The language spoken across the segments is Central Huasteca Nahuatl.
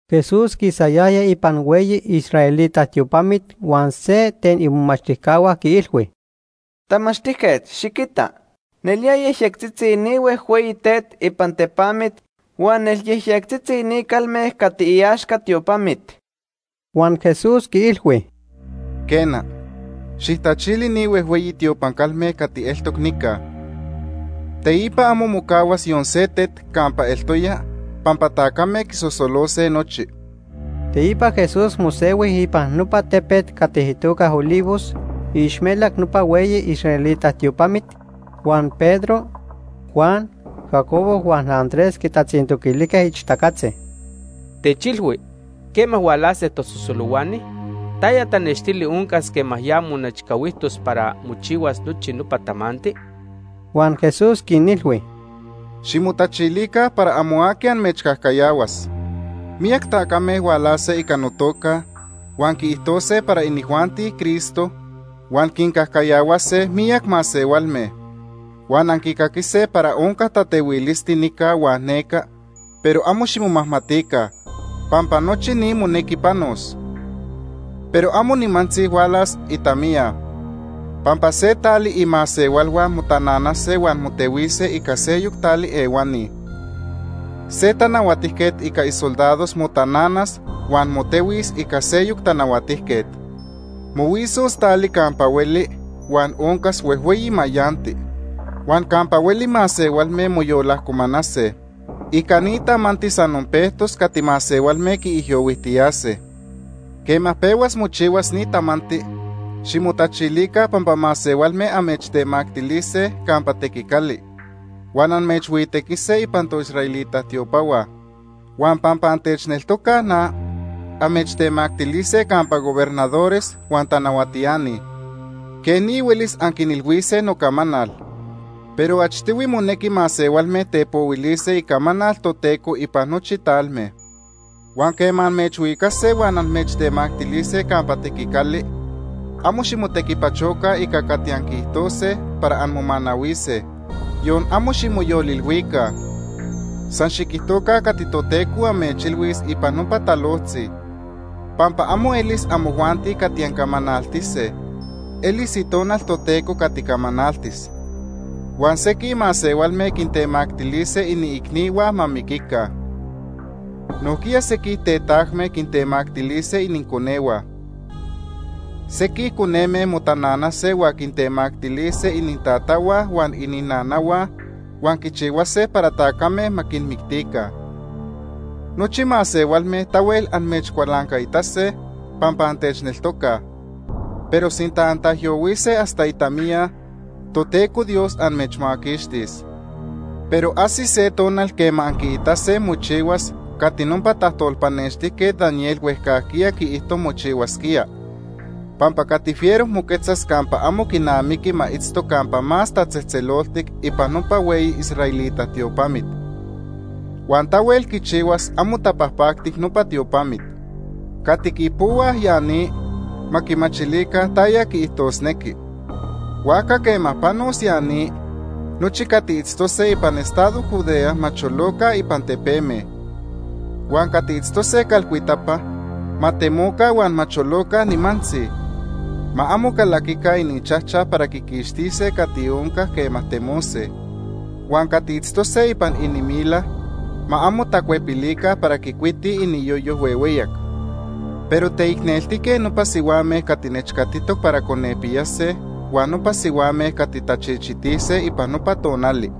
Jesús quisayaya ipan hueyi israelita tiopamit huan se ten imomachtijcahua quiilhui: ―¡Tamachtijquet, xiquita! Nelía yejyectzitzi ni huejhueyi tet ipan tepamit huan nelyejyectzitzi ni calme cati iaxca tiopamit. Huan Jesús quiilhui: ―Quena, xijtachili ni huejhueyi tiopan calme cati eltoc nica. Teipa amo mocahuas yon se tet campa eltoya pampa tacame quisosolose nochi. Teipa Jesús mosehui ipan nopa tepet cati itoca Olivos iixmelac nopa hueyi israelita tiopamit, huan Pedro, Juan, Jacobo huan Andrés quitatzintoquilijque ixtacatzi: ―Techilhui, ¿quema hualase tasosolohuani? ¿Taya tanextili oncas quema ya monechcahuijtos para mochihuas nochi nopa tamanti? Huan Jesús quinilhui: “Ximotachilica para amo aqui amechcajcayahuas. Miyac tacame hualase ica notoca, huan quiijtose para inijuanti Cristo, huan quincajcayahuase miyac masehualme. “Huan anquicaquise para onca tatehuilisti nica huan neca, pero amo ximomajmatica, pampa nochi ni monequi panos. Pero amo nimantzi hualas itamiya. Pampa se tali imasehualhua motananase huan motehuise ica seyoc tali ehuani. Se tanahuatijquet ica isoldados motananas huan motehuis ica seyoc tanahuatijquet. Mohuisos tali campa hueli huan oncas huejhueyi mayanti. Huan campa hueli masehualme moyolajcomanase. Ica ni tamanti san onpejtos cati masehualme quiijyohuijtiyase. “Quema pehuas mochihuas ni tamanti, ximotachilica pampa masehualme amechtemactilise campa tequicali, huan amechhuitequise ipan toisraelita tiopahua. Huan pampa antechneltocaj na, amechtemactilise campa gobernadores huan tanahuatiani. Quej ni huelis anquinilhuise nocamanal. Pero achtohui monequi masehualme tepohuilise icamanal Toteco ipan nochi talme. Huan quema amechhuicase huan amechtemactilise campa tequicali, amo ximotequipachoca ica cati anquiijtose para anmomanahuise. Yon amo ximoyolilhuica. San xiquijtoca cati Toteco amechilhuis ipan nopa talojtzi, pampa amo elis amojuanti cati ancamanaltise, elis Itonal Toteco cati camanaltis. “Huan sequij masehualme quintemactilise iniicnihua ma miquica. Nojquiya sequij tetajme quintemactilise ininconehua. Sequij coneme motananase huan quintemactilise inintatahua huan ininanahua huan quichihuase para tacame ma quinmictica. Nochi masehualme tahuel amechcualancaitase pampa antechneltocaj, pero sinta antaijyohuise hasta itamiya, Toteco Dios amechmaquixtis. “Pero ajsis se tonal quema anquiitase mochihuas cati nopa tajtolpanextijquet Daniel huejcajquiya quiijto mochihuasquía, pampa cati fiero moquetzas campa amo quinamiqui ma itzto Campa Más Tatzejtzeloltic ipan nopa hueyi israelita tiopamit. Huan tahuel quichihuas amo tapajpactic nopa tiopamit. (Cati quipohuaj ya ni, ma quimachilica taya quiijtosnequi.) Huajca quema panos ya ni, nochi cati itztose ipan estado Judea ma choloca ipan tepeme. Huan cati itztose calcuitapa ma temoca huan ma choloca nimantzi; ma amo calaquica ininchajchaj para quiquixtise cati onca quema temose. Huan cati itztose ipan inimila ma amo tacuepilica para quicuitij iniyoyo huehueyac. ¡Pero teicneltique nopa sihuame cati nechcatitoc para conepiyase huan nopa sihuame cati tachichitise ipan nopa tonali!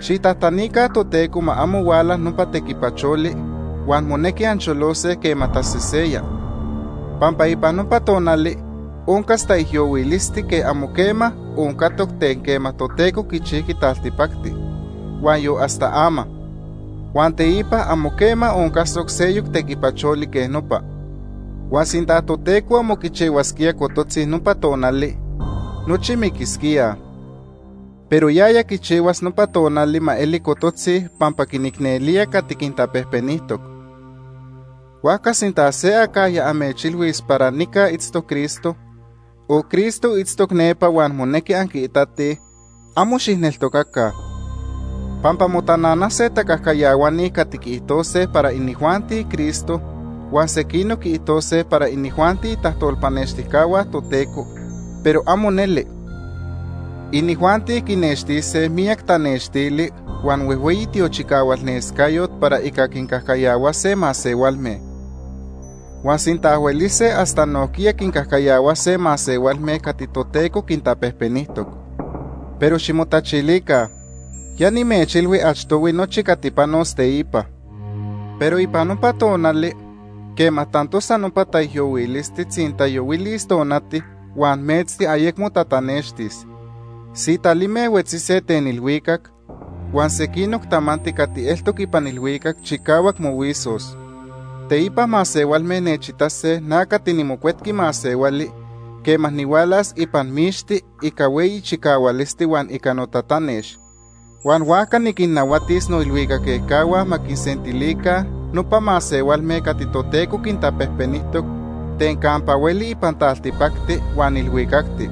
Xijtajtanica Toteco ma amo huala nopa tequipacholi huan monequi ancholose quema taseseya, pampa ipan nopa tonali oncas taijyohuilisti quej amo quema oncatoc ten quema Toteco quichijqui taltipacti huan yon hasta ama. Huan teipa amo quema oncasoc seyoc tequipacholi quej nopa. Huan sinta Toteco amo quichihuasquía cototzi nopa tonali, nochi miquisquíaj. Pero yaya quichihuas nopa tonali ma eli cototzi pampa quinicnelía cati quintapejpenijtoc. “Huajca sinta se acajya amechilhuis para nica itztoc Cristo, o Cristo itztoc nepa huan monequi anquiitatij, amo xijneltocaca. Pampa motananase tacajcayahuani cati quiijtose para inijuanti Cristo, huan sequinoc quiijtose para inijuanti itajtolpanextijcahua Toteco, pero amo neli. Inijuanti quinextise miyac tanextili huan huejhueyi tiochicahualnescayot para ica quincajcayahuase masehualme. Huan sinta huelise, hasta nojquiya quincajcayahuase masehualme cati Toteco quintapejpenijtoc. Pero ximotachilica, ya nimechilhui achtohui nochi cati panos teipa. “Pero ipan nopa tonali, quema tantosa nopa taijyohuilisti, tzintayohuilis tonati, huan metzti ayecmo tatanextis. Sitalime huetzise ten ilhuicac, huan sequinoc tamanti cati eltoc ipan ilhuicacti chicahuac mohuisos. Teipa masehualme nechitase na cati niMocuetqui Masehuali quema nihualas ipan mixti ica hueyi chicahualisti huan ica notatanex. Huan huajca niquinnahuatis noilhuicac ejcahua ma quinsentilica nopa masehualme cati Toteco quintapejpenijtoc ten campa hueli ipan taltipacti huan ilhuicacti.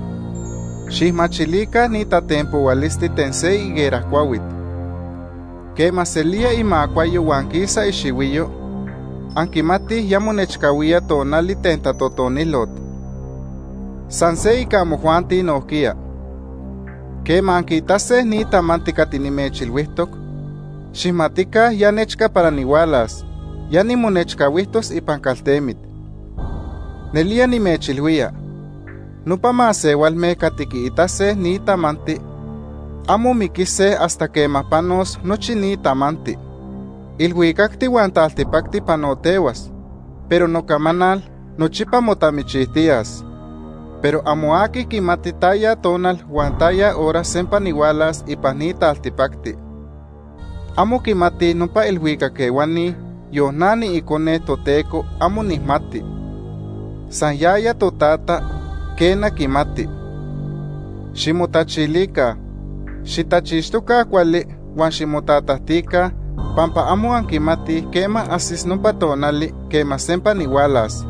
“Xijmachilica ni tatenpohualisti ten se higuera cuahuit. Quema selía imacuayo huan quisa ixihuiyo, anquimatij ya monechcahuía tonali ten tatotonilot. San se ica amojuanti nojquiya. Quema anquiitase ni tamanti cati nimechilhuijtoc, xijmatica ya nechca para nihualas, ya nimonechcahuijtos ipan caltemit. Nelía nimechilhuía, nopa masehualme cati quiitase ni tamanti amo miquise hasta quema panos nochi ni tamanti. Ilhuicacti huan taltipacti panotehuas, pero nocamanal nochipa motamichijtiyas. “Pero amo aqui quimati taya tonal huan taya hora sempa nihualas ipan ni taltipacti. Amo quimatij nopa ilhuicac ehuani, yon na niIcone Toteco amo nijmati. San yaya Totata, quena quimati. “Ximotachilica, xitachixtoca cuali huan ximotatajtica pampa amo anquimatij quema ajsis nopa tonali quema sempa nihualas.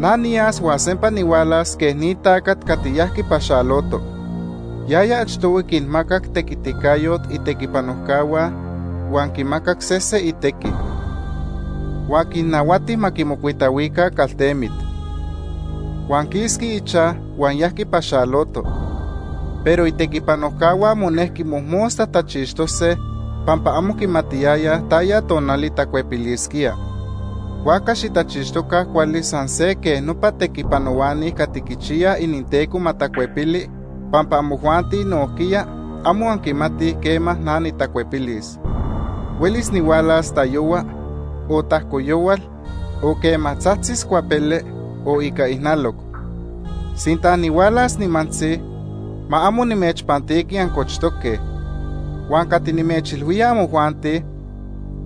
Na niyas huan sempa nihualas quej ni tacat cati yajqui paxaloto. Yaya achtohui quinmacac tequiticayot itequipanojcahua huan quimacac sese itequi. Huan quinnahuati ma quimocuitahuica caltemit. Huan quisqui ichaj huan yajqui paxaloto, pero itequipanojcahua monejqui mojmosta tachixtose pampa amo quimatiyayaj taya tonali tacuepilisquía. Huajca xitachixtoca cuali san se quej nopa tequipanohuani cati quichiyaj ininteco ma tacuepili pampa amojuanti nojquiya, amo anquimatij quema na nitacuepilis. Huelis nihualas tayohua, o tajco yohual, o quema tzajtzis cuapele, o ica ijnaloc. Sinta nihualas nimantzi, ma amo nimechpantiqui ancochtoque. Huan cati nimechilhuía amojuanti,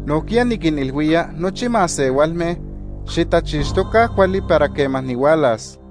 nojquiya niquinilhuía nochi masehualme, xitachixtoca cuali para quema nihualas.”